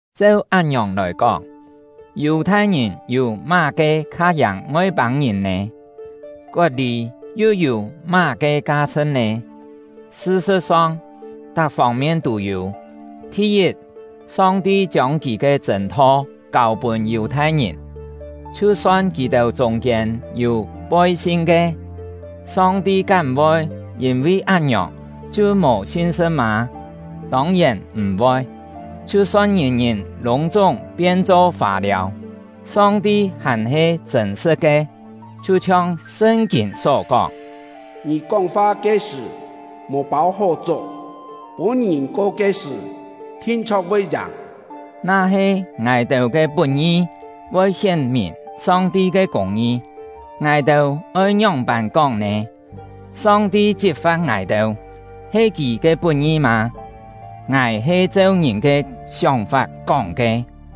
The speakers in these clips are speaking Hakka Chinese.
Cheu án-ngiòng lòi kóng, Yù-thai-ngìn yû má-ke kha yàng Ngoi-pâng-ngìn nè? Kot-lî yu yû má-ke ka-chhṳ̍t nè? Sṳ-sṳ̍t-song, tak fông-mien tû yû. Thi-yit, Song-ti chiông Kì ke chṳ̂n-tho kâu pûn Yù-thai-ngìn. Chhiu-son kì-têu chûng-kiên yû poi-sin ke, Song-ti kám voi yîn-vi án-ngiòng chhiu mò sin-sṳ̍t mâ? Tông-yèn m̀-voi! Chhiu-son ngìn-ngìn lûng-chúng pien-cho fâ-liâu, Song-ti hàn-he chṳ̂n-sṳ̍t ke; chhiu-chhiong Sṳn-kîn só kóng: Ngì kóng-fa ke sṳ̀, mò pâu hó chok, pûn-ngìn ko ke sṳ̀, thin-chho̍k voi yàng. Na-he ngài-têu ke put-ngi voi hién-mìn Song-ti ke kûng-ngi, ngài-têu oi ngióng-pân kóng nè? Song-ti chit-fa̍t ngài-têu, he Kì ke put-ngi mâ? (Ngài he cheu ngìn ke sióng-fap kóng ke.)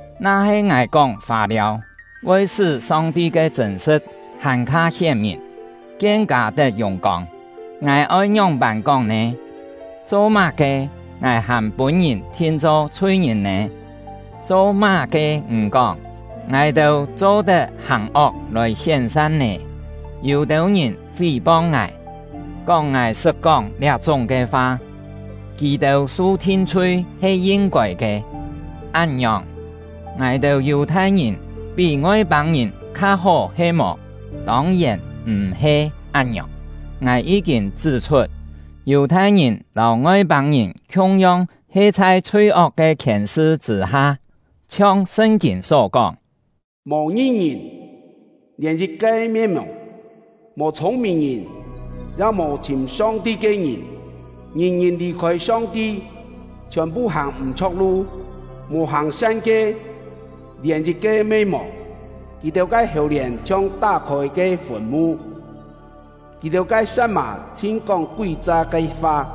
Na-he ngài kóng fâ-liâu voi sṳ́ Song-ti ke chṳ̂n-sṳ̍t hàn-kha hién-mìn, kien-kâ tet yùng-kông, ngài oi ngióng-pân kóng nè? Cho-má-ke ngài hàn pûn-ngìn thin-cho chhui-ngìn nè? Cho-má-ke m̀ kóng: “Ngài-têu cho-tet hàng ok lòi hién san” nè? Yû-têu ngìn fí-pong ngài, kóng ngài sṳt kóng liá-chúng ke fa; kì-têu su thin-chhui he yin-kôi ke. Án-ngiòng, ngài-têu Yù-thai-ngìn pí Ngoi-pâng-ngìn kha-hó he-mò? Tông-yèn m̀-he án-ngiòng! Ngài yí-kîn chṳ́-chhut, Yù-thai-ngìn lâu Ngoi-pâng-ngìn khiung-yong he chhai chhui-ok ke khièn-sṳ chṳ̂-ha. Chhiong Sṳn-kîn só kóng: Mò ngi-ngìn, lièn yit-ke me mò. Mò chhûng-mìn-ngìn, ya mò chhìm Song-ti ke ngìn. Ngìn-ngìn lì-khôi Song-ti, chhiòn-phu hàng m̀-chho̍k lu; mò hàng-san ke, lièn yit-ke me mò. Kì-têu ke hèu-lièn chhiong tá-khôi ke fùn-mu; kì-têu ke sa̍t-mà chhin kóng kúi-cha ke fa;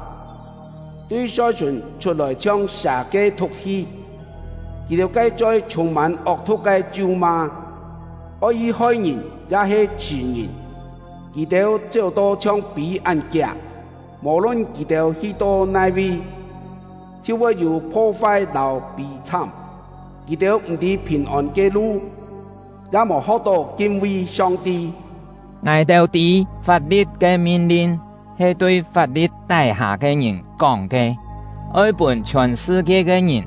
tui choi-sùn chhut ke chhiong he sà ke thu̍k-hi; Kì-têu ke choi chhûng-mân ok-thu̍k ke chu-ma. Oi hi hoi-ngìn ya-he chhṳ̀-ngìn, kì-têu chéu-to chhiong pî án kiak; mò-lun kì-têu hi-to nai-vi, chhiu voi yû pho-fai lâu pî-chhám. Kì-têu m̀-tî phìn-ôn ke lu; ya mò ho̍k-tó kin-vi Song-ti. Ngài-têu tî, fap-li̍t ke min-lin he tui chhai fap-li̍t tái-hâ ke ngìn kóng ke, oi pûn chhiòn sṳ-kie ke ngìn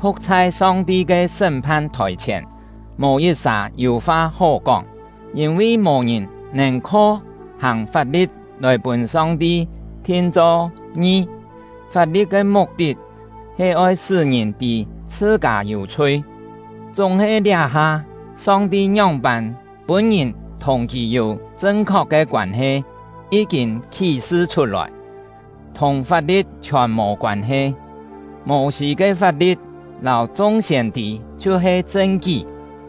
phu̍k chhai Song-ti ke sṳ́m-phan thòi-chhièn, mò yit-sà yû fa hó kóng. Yîn-vi mò ngìn nèn kho hàng fap-li̍t lòi pûn Song-ti thin-cho ngi; fap-li̍t ke muk-tit he oi pûn ngìn tî chhṳ-kâ yû chhui. Chúng-he liá-ha, Song-ti ngióng-pân pûn ngìn thùng Kì yû chṳn-khok ke koân-he yí-kîn khí-sṳ chhut-lòi; thùng fap-li̍t chhiòn mò koân-he. Mô-sî ke fap-li̍t lâu chung siên-tî chhiu-he chṳn-kí.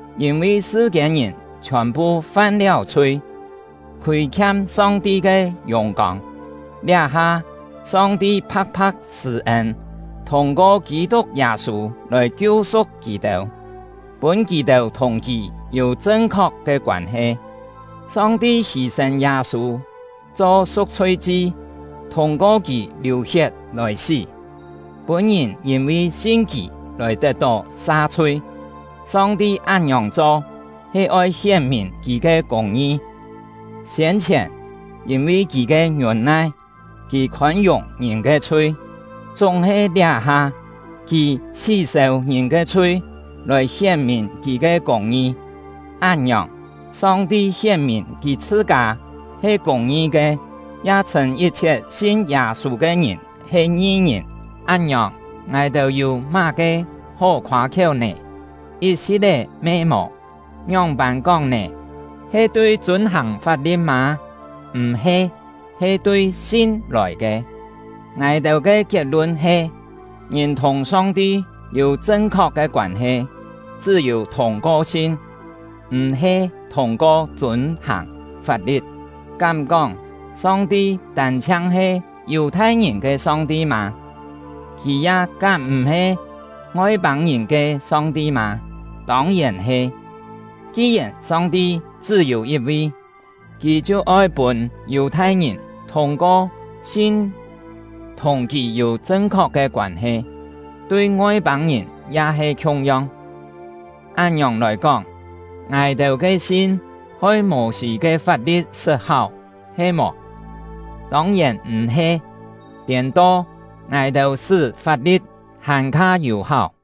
Yîn-vi sṳ-kiên-ngìn chhiòn-phu fam-liáu chhui, khûi-khiam Song-ti ke yùng-kông. Liá-ha, Song-ti pha̍k-pha̍k sṳ̂-ên, thûng-ko Kî-tuk Yâ-sû lòi kiu-su̍k kì-têu, pûn kì-têu thùng Kì yû chṳn-khok ke koân-he. Song-ti hî-sên Yâ-sû cho su̍k-chhui-chi, thûng-ko kì liù-hiet lòi sí, pûn ngìn yîn-vi sin kì lòi tet-tó sa-chhui. Song-ti án-ngiòng cho he oi hién-mìn Kì ke kûng-ngi. Siên-chhièn, yîn-vi Kì ke ngiûn-nai, Kì khôn-yùng ngìn ke chhui; chúng-he liá-ha, Kì chhí-sêu ngìn ke chhui lòi hién-mìn Kì ke kûng-ngi. Án-ngiòng, Song-ti hién-mìn Kì chhṳ-kâ he kûng-ngi ke, ya chhṳ̂n yit-chhiet sin Yâ-sû ke ngìn he ngi-ngìn. Án-ngiòng, ngài-têu yû má-ke hó khoâ-khiéu nè? Yit-si̍t-é me mò! Ngióng-pân kóng nè? He tui chûn-hàng fap-li̍t mâ? M̀-he! He tui sin lòi ke. Ngài-têu ke kiet-lun he: Ngìn thùng Song-ti yû chṳn-khok ke koân-he chṳ́-yû thûng-ko sin, m̀-he thûng-ko chûn-hàng fap-li̍t. Kám kóng Song-ti tân-chhiang he Yù-thai-ngìn ke Song-ti mâ? Kì ya kám m̀-he Ngoi-pâng-ngìn ke Song-ti mâ? Tông-yèn he! Ki-yèn Song-ti chṳ́-yû yit-vi, Kì chhiu oi pûn Yù-thai-ngìn thûng-ko sin thùng Kì yû chṳn-khok ke koân-he, tui Ngoi-pâng-ngìn ya he khiung-yong. Án-ngiòng lòi kóng, ngài-têu ke sin hoi Mô-sî ke fap-li̍t sṳt-háu he-mò? Tông-yèn m̀-he! Tiên-to, ngài-têu sṳ́ fap-li̍t hàn-kha yû-háu.